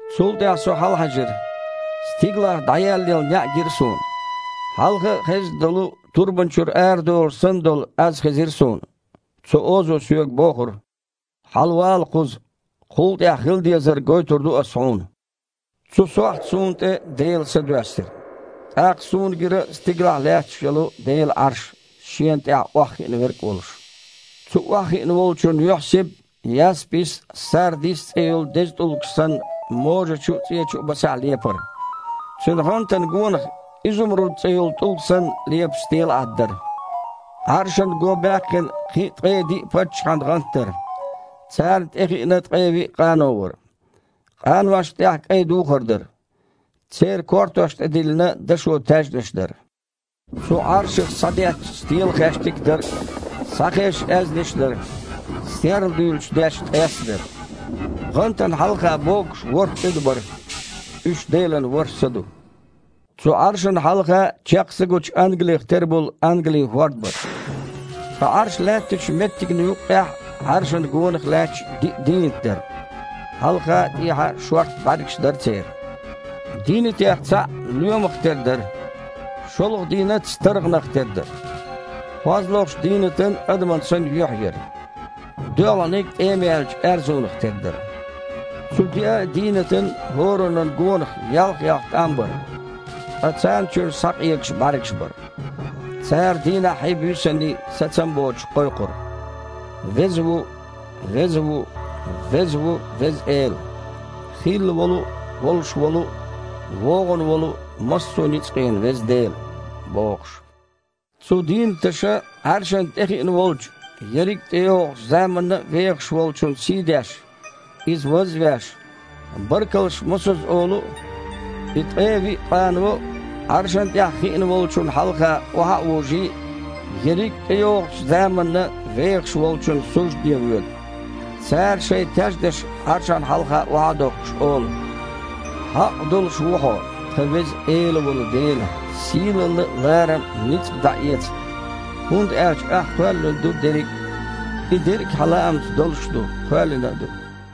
Цул тІаьхьа со хьалахьаьжира. Стигалахь дІаеллаелла неІ гира суна. Хьалха а хезна долу, турбана чуьра арадолуш санна долу, аз хезира суна. Цу озо соьга бохура: «Хьалавала кхуза, кхул тІаьхьа хила дезарг гойтур ду Ас хьуна». Цу сохьта суна тІе Делан Са доьссира. ТІаккха суна гира стигалахь лаьтташ йолу Делан Іарш, шена тІехь охьахиъна Верг а волуш. Цу охьахиъна Волчун юьхьсибат, «яспис», «сардис» цІе йолу деза тІулгаш санна, можачу а, цІечу а басахь лепара. Цуьнан гІантана гонах, «изумруд» цІе йолу тІулг санна, лепаш стелаІад дара. Іаршана гобаьккхина кхин а ткъе диъ паччахьан гІант дара. Царна тІе хиъна ткъе виъ къано вара. Къаношна тІехь кІайн духар дара. Церан кортош тІе диллина дашо таьжнаш дара. Цу Іаршах схьадетташ стелахаьштиг а дара, схьахезаш аьзнаш а дара, серладуьйлуш детташ ткъес а дара. ГІантана хьалха богуш ворхІ къуьда бара. Уьш Делан ворхІ Са ду. Цу Іаршана хьалха чекх са гучу ангалих тера болу ангалин хІорд бара. Ткъа Іарш лаьттачу меттигна юккъехь а, Іаршана гонах а лаьтташ диъ дийнат дара. Хьалх а, тІехь а шорта бІаьргаш дара церан. Дийнатех цхьаъ лоьмах тера дара. ШолгІа дийнат старгІанах тера дара. КхозлагІчу дийнатан, адаман санна, юьхь яра. ДоьалгІаниг тІемаяьллачу аьрзунах тера дара. Цу деъа а дийнатан хІораннан а гонах ялх-ялх тІам бара, ткъа царна чуьра схьакъегаш бІаьргаш бара. Цара, дийнаххьий, буьйсанний, сацам а боцуш, кхойкхура: «Веза ву, веза ву, веза ву Веза Эла, хилла волу а, волуш волу а, вогІун волу а массо ницкъийн Веза Дела», – бохуш. Цу дийнаташа Іаршана тІе хиъна волчу, ерриг а тІейогІучу заманна а вехаш Волчун сийдеш, Иза ваз а веш, баркаллаш мосазза олу а, и ткъе виъ къано Іаршана тІехь хиъна Волчунна хьалха охьа а вужий, ерриг а тІейогІучу заманна вехаш Волчунна суждане воьду. Цара, шайн таьжнаш Іаршана хьалха охьа а дохкуш, олу: «Хьакъ долуш ву Хьо, тхан Веза Эла волу Дела, сийлалла а, ларам а, ницкъ а дІаэца. ХІунда аьлча Ахь кхоьллина ду дерриг а. И дерриг а Хьан лаамца долуш а ду, кхоьллина а ду».